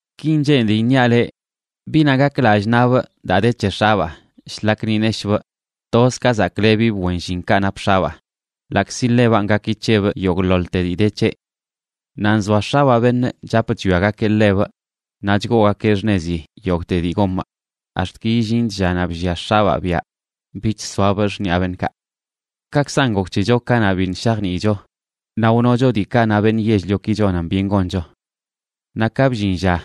Kin cheenidꞌ iṉiaꞌ leꞌ: biꞌnaꞌ gak lallꞌ naꞌbꞌ daa de c̱he x̱abaa, shlak ni neshꞌbꞌ toz ka zaklebibꞌ wen llinkaꞌ nap x̱abaa, ḻaꞌkzi ḻebanꞌ gaki c̱hebꞌ yogꞌḻoḻte dii de c̱heꞌ. Naꞌ nzoa x̱abaa beṉꞌ chap chwiagakeꞌ ḻebꞌ naꞌ chgoogakeꞌ xṉezi yogꞌte dii gomꞌ ax̱t ki illinch llanaꞌ bllia x̱abaa biaꞌ bich soabꞌ xṉiꞌa beṉꞌkaꞌ. Kaꞌkzan gok c̱hecho kanaꞌ biṉꞌ shajniicho, naꞌ wnocho diikaꞌ na beṉꞌ yell-lioki chonan byen goncho. Naꞌ ka bllin lla,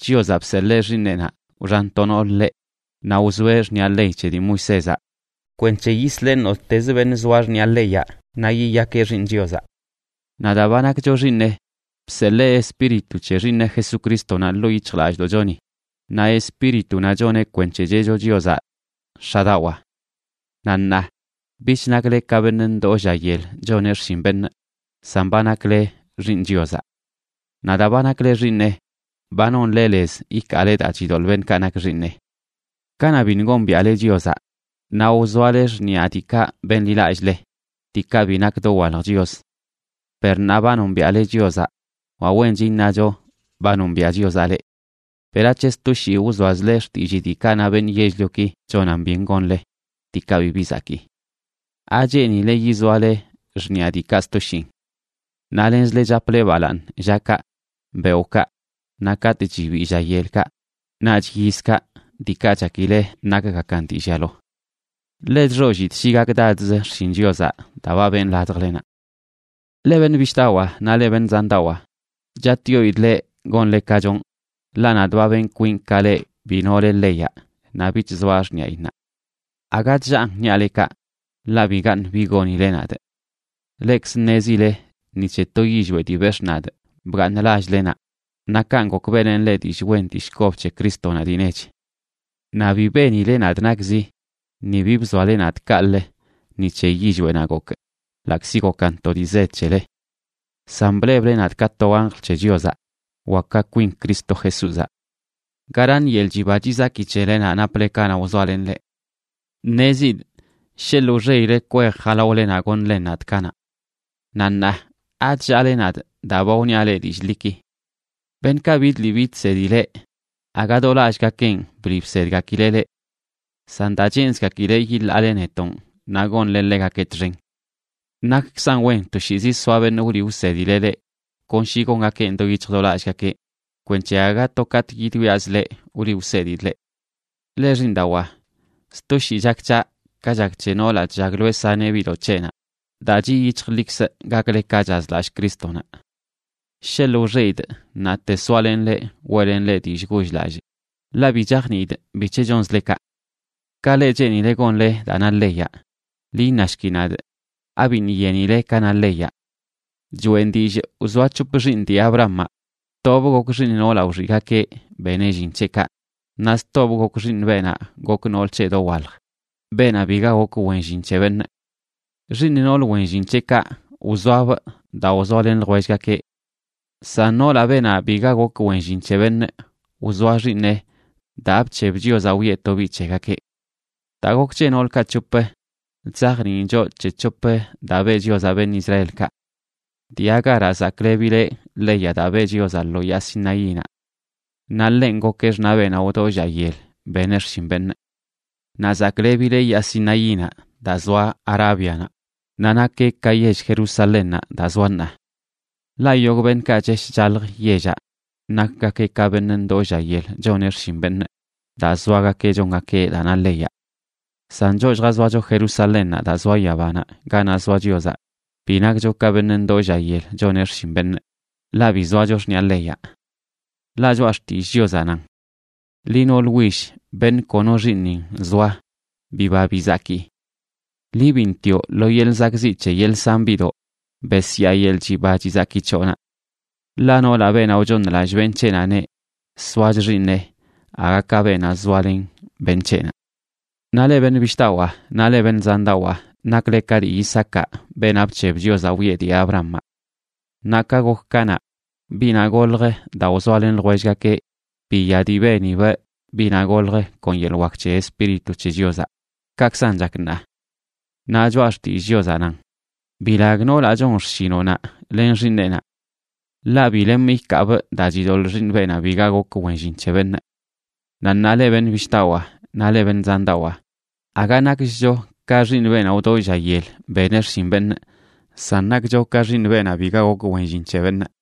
Chiozaꞌ bseḻee Xiiṉeꞌnaꞌ, wxan to nool ḻeꞌ, naꞌ wzoeꞌ xṉiꞌa ley c̱he dii Moisézaꞌ kwenc̱he yisleꞌ nottezə beṉꞌ zoa xṉiꞌa leyaꞌ naꞌ yiyakeꞌ xiiṉ Chiozaꞌ. Naꞌ daa ba nakcho xiiṉeꞌ, bseḻee Espíritu c̱he Xiiṉeꞌ Jesucrístonaꞌ ḻoo yic̱hjlallꞌdoꞌchoni, naꞌ Espíritunaꞌ choneꞌ kwenc̱he cheꞌcho Chiozaꞌ: “X̱adawaa.” Naꞌ ṉaa, bich nakle ka beṉꞌ ndoo lla yel choneꞌ xshin beṉꞌ, san ba nakle xiiṉ Chiozaꞌ. Naꞌ daa ba nakle xiiṉeꞌ, ba nonle lez ikaale daa chidoḻꞌ beṉꞌkaꞌ nak xiiṉeꞌ. Kanaꞌ biṉꞌ gombiaꞌle Chiozaꞌ, naꞌ wzoale xṉiꞌa diikaꞌ benḻilallꞌle, diikaꞌ bi nak dowalj chios. Per ṉaa ba nombiaꞌle Chiozaꞌ, wa wench iṉacho ba nombiaꞌ Chiozaꞌ leꞌ, ¿berac̱he sto shii wzoazle xtillii diikaꞌ na beṉꞌ yell-lioki chonan byen gonle, diikaꞌ bibi zakii? ¿Acheenile yizoale xṉiꞌa diikaꞌ sto shiin? Naꞌ lenzle chaple balaaṉ llakaꞌ, beoꞌkaꞌ, naꞌ katꞌ chibii lla yelkaꞌ, naꞌch yizkaꞌ, diikaꞌ chakile nakgakan dii llialo. Ḻe chxollidꞌ shi gakdadz xshin Chiozaꞌ daa ba benꞌ ladjlenaꞌ. Leꞌ beṉꞌ bishꞌdawaa naꞌ leꞌ beṉꞌ zandawaa, chatꞌyoidꞌ leꞌ gonle ka chonꞌ, ḻaꞌ nadꞌ ba benꞌ kwinꞌ ka leꞌ bi nole leyaꞌ naꞌ bich zoaꞌ xṉiꞌayinnaꞌ. Aga chllaan niaꞌ leꞌ kaꞌ, ḻaꞌ bigaṉꞌ bi gonile nadꞌ. Leꞌkzə ṉezile ni c̱he to yillweꞌ dii bex̱ꞌ nadꞌ bgaaṉꞌ lall-lenaꞌ, naꞌ kanꞌ gok beꞌlenꞌ leꞌ dillꞌ wen dillꞌ kob c̱he Crístonaꞌ dii nech. Naꞌ bi benile nadꞌ nakzi ni bi bzoale nadꞌ kaꞌlə ni c̱he yillweꞌnaꞌ gokꞌ, ḻaꞌkzi gokan to dii zed c̱hele. San bleble nadꞌ ka to anjl c̱he Chiozaꞌ wa ka kwin Cristo Jesúzaꞌ. ¿Garaṉ yeḻꞌ chiba chizaki c̱helenaꞌ naple kanaꞌ wzoalenꞌ leꞌ? Ṉezidꞌ sheḻꞌ wxeꞌile kwej jalaolenaꞌ goṉlen nadꞌ kanaꞌ. Naꞌ ṉaa, ¿achllaale nadꞌ daa ba wniaꞌ leꞌ dillꞌ ḻiki? Beṉꞌkaꞌ bidliꞌ bidsedi leꞌ, aga do lallꞌgakenꞌ bliꞌ bsedgakileꞌ leꞌ. San daa cheenzgakileꞌ yiḻaale netonꞌ naꞌ gonle ḻegakeꞌ txen. Nakkzan wen toshiizi soa beṉꞌ wliꞌ wsedileꞌ leꞌ kon shi gongakeꞌn do yic̱hj do lallgakeꞌ, kwenc̱he aga to katꞌ yidwiazꞌ leꞌ wliꞌ wsedidꞌ leꞌ. Leꞌ xiiṉdawaa, sto shii chak c̱haꞌ ka chak c̱he noolaꞌ chllagloeꞌ saneꞌ biꞌdoꞌ c̱heꞌnaꞌ daa chiꞌ yic̱hjlikzꞌ gakle ka chazlallꞌ Crístonaꞌ. Sheḻꞌ wxeꞌidꞌ ṉaate soalenꞌ leꞌ weꞌlenꞌ leꞌ dillꞌ goll-lallꞌ, ḻaꞌ bi chajniidꞌ bic̱he chonzle kaꞌ. Ka leꞌ cheenile gonle daa na leyaꞌ, ḻi iṉashki nadꞌ: ¿abiṉꞌ yenile ka na leyaꞌ? Choꞌen dillꞌ wzoa c̱hop xiiṉ dii Abrahamaꞌ: tobꞌ gok xiiṉ noolaꞌ wxiꞌgakeꞌ beneꞌ llin c̱heꞌkaꞌ, naꞌ stobꞌ gok xiiṉ beenaꞌ gok nool c̱heꞌ dowalj, beenaꞌ biga gok wen llin c̱he beṉꞌ. Xiiṉ nool wen llin c̱heꞌkaꞌ wzoabꞌ daa wzoalen ljwellgakeꞌ. San noolaꞌ, beenaꞌ biga gok wen llin c̱he beṉꞌ, wzoa xiiṉeꞌ daa bc̱heb Chiozaꞌ wiꞌe to biꞌ c̱hegakeꞌ. Daa gok c̱he noolkaꞌ c̱hop, chzajniin choꞌ c̱he c̱hop daa beꞌ Chiozaꞌ beṉꞌ Israelkaꞌ. Dii Agaraꞌ zaklebileꞌ leyaꞌ daa beꞌ Chiozaꞌ lo yaa Sinaínaꞌ. Naꞌ ḻenꞌ gokeꞌ xṉaꞌ beenaꞌ wdoo lla yel beneꞌ xshin beṉꞌ. Naꞌ zaklebileꞌ yaa Sinaínaꞌ daa zoa Arábianaꞌ, naꞌ nakeꞌ ka yell Jerusalénnaꞌ daa zoa ṉaa. Ḻaꞌ yogꞌ beṉꞌkaꞌ chesh chalj yellaꞌ nakgakeꞌ ka beṉꞌ ndoo lla yel choneꞌ xshin beṉꞌ daa zoagakeꞌ chongakeꞌ daa na leyaꞌ. San choꞌ lljazoacho Jerusalénnaꞌ daa zoa yabanaꞌ ganaꞌ zoa Chiozaꞌ, bi nakcho ka beṉꞌ ndoo lla yel choneꞌ xshin beṉꞌ, ḻaꞌ bi zoacho xṉiꞌa leyaꞌ. Ḻaꞌ Choꞌa Xtillꞌ Chiozaꞌ nan: Liꞌ nool will, beṉꞌ kono xiiṉin zoa, biba bizaki. Liꞌ biṉꞌ tioꞌ lo yeḻꞌ zakꞌziꞌ c̱he yeḻꞌ san biꞌdoꞌ, besyaa yeḻꞌ chiba chizaki c̱hoꞌnaꞌ. Ḻaꞌ noolaꞌ, beenaꞌ wchooṉlallꞌ beṉꞌ c̱heꞌnaꞌneꞌ, soach xiiṉeꞌ aga ka beenaꞌ zoalen beṉꞌ c̱heꞌnaꞌ. Naꞌ leꞌ beṉꞌ bishꞌdawaa naꞌ leꞌ beṉꞌ zandawaa, nakle ka dii Isaacaꞌ, beenaꞌ bc̱heb Chiozaꞌ wiꞌe dii Abrahamaꞌ. Naꞌ ka gok kanaꞌ, biꞌnaꞌ golj daa wzoalen ljwellgakeꞌ, biya dii benibꞌ biꞌnaꞌ golj kon yeḻꞌ wak c̱he Espíritu c̱he Chiozaꞌ, kakzan chak ṉaa. Naꞌ Choꞌa Xtillꞌ Chiozaꞌ nan: “Bilag noolaꞌ chon xshinoꞌnaꞌ len xiiṉeꞌnaꞌ. Ḻaꞌ bi lemꞌ ikaabꞌ daa chidoḻꞌ xiiṉ beenaꞌ biga gok wen llin c̱he beṉꞌ.” Naꞌ ṉaa, leꞌ beṉꞌ bishꞌdawaa naꞌ leꞌ beṉꞌ zandawaa, aga nakchcho ka xiiṉ beenaꞌ wdoo lla yel beneꞌ xshin beṉꞌ, san nakcho ka xiiṉ beenaꞌ biga gok wen llin c̱he beṉꞌ.